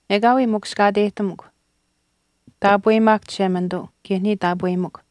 “Ekaawii mukushkaateyihtamukw. Taapweyimaahkw Chishemanituu kaye niya taapweyimikw.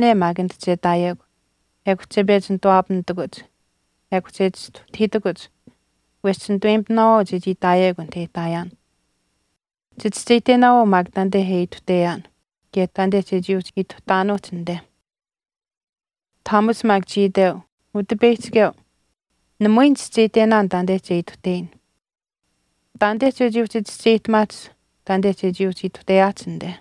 Chiishihtaayaane maak anit che ihtaayekw, ekw che pechi nituwaapamitakuch ekw che chistuhtahiitakuch wesh chinituweyimitinaawaau chechii ihtaayekw anit e ihtaayaan. Chichischeyihtenaawaau maak taanite e ituhteyaan kaye taanite chechii uhchi ituhtaanuuhch anite.” Thomas maak chii iteu, “Utipeyihchikeu, namui nichischeyihtenaan taanite che ituhteyin, taanite chechii uhchi chischeyihtamaahch taanite chechii uhchi ituhteyaahch anite.”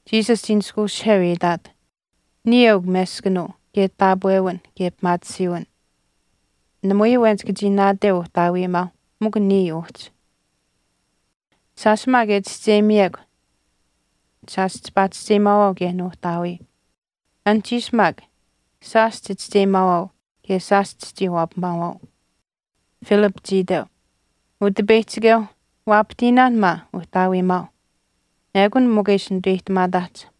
Jesus chii nishkweushiheu e itaat, “Niya eukw meskanuu kaye taapwewin kaye pimaatisiiwin, namui awen chika chii naateu Uhtaawiimaau mikw niya uhchi. Shaash maak e chischeyimiyekw shaash chipaa chischeyimaawaau kaye Nuuhtaawii. Anuhchiish maak shaash chichischeyimaawaau kaye shaash chichii waapamaawaau.” Philip chii iteu, “Utipeyihchikeu waapahtiinaan maa Uhtaawiimaau, ekun mikw e ishi nituweyihtamaataahch.”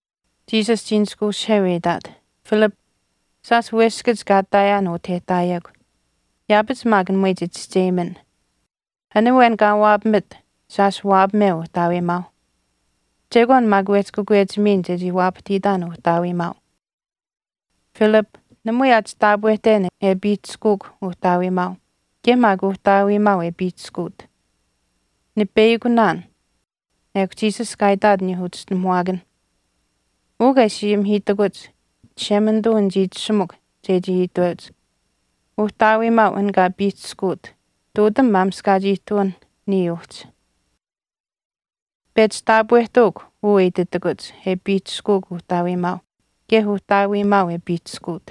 Jesus chii nishkweushiheu e itaat, “Philip, shaash weskach kaa ihtaayaan utah e ihtaayekw yaapach maak namui chichischeyimin. An awen kaa waapamit shaash waapameu Uhtaawiimaau. Chekwaan maak wehchi kakwechimiin chechii waapahtiitaan Uhtaawiimaau. Philip, namui aa chitaapwehten e piihchishkuuk Uhtaawiimaau kaye maak Uhtaawiimaau e piihchishkuut. Nipeyakunaan.” Ekw Jesus kaa itaat aniyuuh uchischinuhamuwaakanh, “Uu kaa ishi ayimihiitakuch Chishemanituu nichii itashumikw chechii iteuch. Uhtaawiimaau an kaa piihchishkuut ihtuutam maamishkaach ihtuwinh niya uhchi. Pechi taapwehtuukw uu e ititakuch e piihchishkuuk Uhtaawiimaau kaye Uhtaawiimaau e piihchishkuut.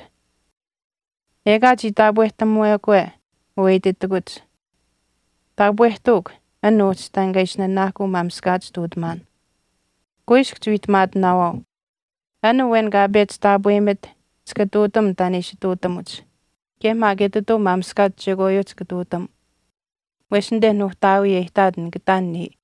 Ekaa chii taapwehtamuwekwe uu e ititakuch taapwehtuukw an uhchi taan kaa ishi nanaahkuu maamishkaach ihtuutamaan. Kuiskw chiwiihtamaatinaawaau, an awen kaa pechi taapweyimit chika ihtuutam taan e ishi ihtuutamuch kaye maak etituu maamishkaach chekwaayuuh chika ihtuutam wesh anite Nuuhtaawii e ihtaat nika ihtaan niya.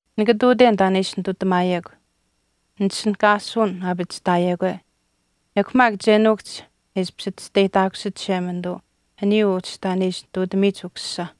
Nika ihtuuten taan e ishi nitutamaayekw nitishinihkaasuwin aapachihtaayekwe, ekw maak che nuukuhch e ishpish chisteyihtaakusit Chishemanituu aniyuu uhchi taan e ishi ihtuutamiyich Ukusisa.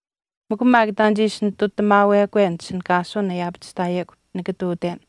Mikw taan che ishi nitutamaawekwe nitishinihkaasuwin e aapachihtaayekw nika ihtuuten.”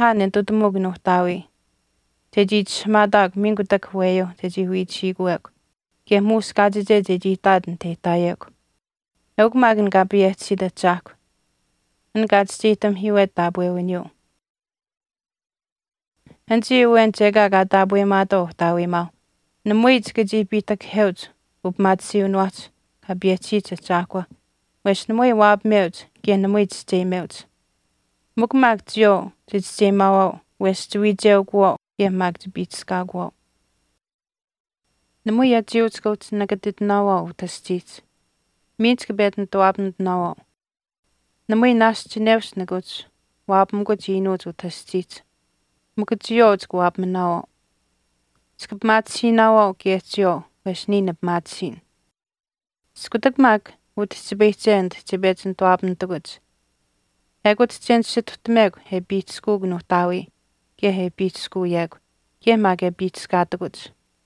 Nika ayimihaan e nitutamuuk Nuuhtaawii chechii itishahamaataakw miin kutak aweyuuh chechii wiichihiikuwekw kaye muush kaachiche chechii ihtaat anit e ihtaayekw. Eukw maak an Kaa payehchisiit Ahchaahkw, an kaa chischeyihtamihiiwet taapwewiniyuu. Nichii awenich ekaa kaa taapweyimaatwaau uhtaawiimaau namui chika chii piihtakaheuch upimaatisiiwiniwaahch Kaa payehchisiyich Ahchaahkwa, wesh namui waapameuch kaye namui chischeyimeuch. Mikw maak chiyawaau chichischeyimaawaau wesh chiwiicheukuwaau kaye maak chika piihchishkaakuwaau.” “Namui achiyuu chika uhchi nakatitinaawaau utah aschiihch. Miin chika pechi nituwaapamitinaawaau. Namui naashch chineush nika uhchi waapamikuch iinuuch utah aschiihch, mikw chiyawaau chika waapaminaawaau. Chika pimaatisiinaawaau kaye chiyawaau wesh niya nipimaatisiin. Iskutak maak utihchipayihche anit che pechi nituwaapamitikuch ekut che nisituhtamekw e piihchishkuuk Nuuhtaawii kaye e piihchishkuuyekw, kaye maak e piihchishkaatakuch.”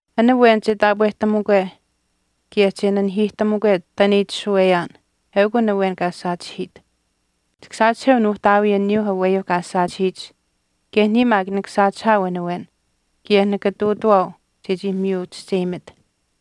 “An awen che taapwehtamukwe kaye che nanihiihtamukwe taan e itashuweyaan eukw an awen kaa saachihiit. Chika saachiheu Nuuhtaawii aniyuu aweyuu kaa saachihiyich, kaye niya maak nika saachihaau an awen kaye nika ihtuutawaau chechii miyu chischeyimit.”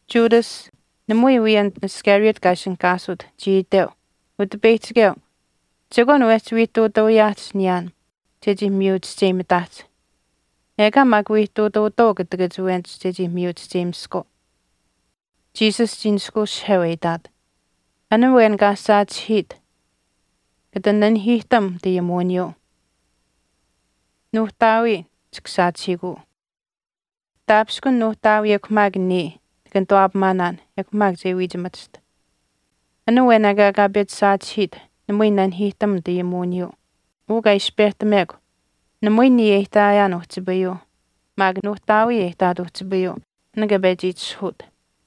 Judas, namui wii an Iscariot kaa ishinihkaasut, chii iteu, “Utipeyihchikeu, chekwaan wehchi wii ihtuutuuyaahch niyaan chechii miyu chischeyimitaahch, ekaa maak wii ihtuutuutwaau kutakach awenich chechii miyu chischeyimiskwaau.” Jesus chii nishkweushiheu e itaat, “An awen kaa saachihiit kata nanihiihtam nitayimuwiniyuu. Nuuhtaawii chika saachihiikuu. Taapishkun Nuuhtaawii ekw maak niya nika nituwaapamaanaan ekw maak che wiichimachiht. An awen ekaa kaa pechi saachihiit namui nanihiihtam nitayimuwiniyuu. Uu kaa ishi pehtamekw namui niya e ihtaayaan uhchipayuu maak Nuuhtaawii e ihtaat uhchipayuu, an kaa pechi itishahuut.”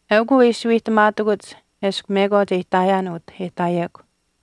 “Eukw uu e ishi wiihtamaatakuch eshkw mekwaach e ihtaayaan utah e ihtaayekw.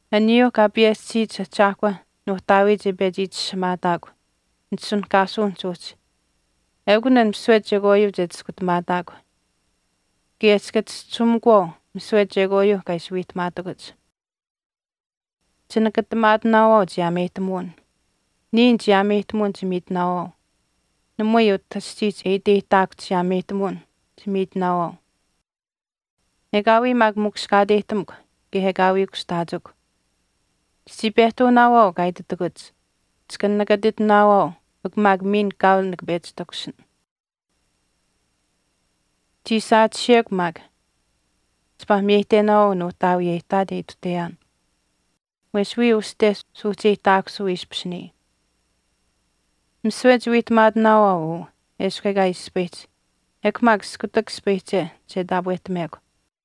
Aniyuu Kaa payehchisiyich Ahchaahkwa Nuuhtaawii che pechi itishahamaataakw nitishinihkaasuwinihch uhchi ekun an misiwe chekwaayuu che chiskutamaataakw kaye chika chischisuumikuwaau misiwe chekwaayuu kaa ishi wiihtamaatakuch.” “Chinakatamaatinaawaau chiyaameyihtamuwin. Niya nichiyaameyihtamuwin chimiitinaawaau. Namui utah aschiihch e iteyihtaakuhch chiyaameyihtamuwin chimiitinaawaau. Ekaawii maak mukushkaateyihtamukw kaye ekaawii kushtaachikw. Chichii pehtuunaawaau kaa ititakuch, ‘Nika nikatitinaawaau mikw maak miin kaau nikapechi takushin.’ Chii saachihiyekw maak chipaa miyeyihtenaawaau Nuuhtaawii e ihtaat e ituhteyaan, wesh wiya uste suuhcheyihtaakusuu ishpish niya. Misiwe chiwiihtamaatinaawaau uu eshkw ekaa ispayihch, ekw maak iskutak ispayihche che taapwehtamekw.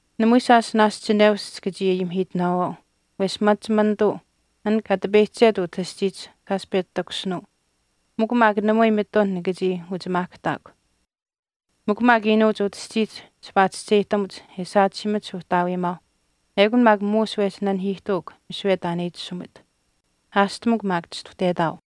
Namui shaash naashch chineush chika chii ayimihiitinaawaau, wesh machimanituu, an kaa tipeyihchiket utah aschiihch shaash pechi takushinuu. Mikw maak namui mitun nika chii uchimaahkahtaakw. Mikw maak iinuuch utah aschiihch chipaa chischeyihtamuch e saachihiimach Uhtaawiimaau ekun maak muush wehchi nanihiihtuuk misiwe taan e itashumit. Aashtamukw maak chistuhtetaau.”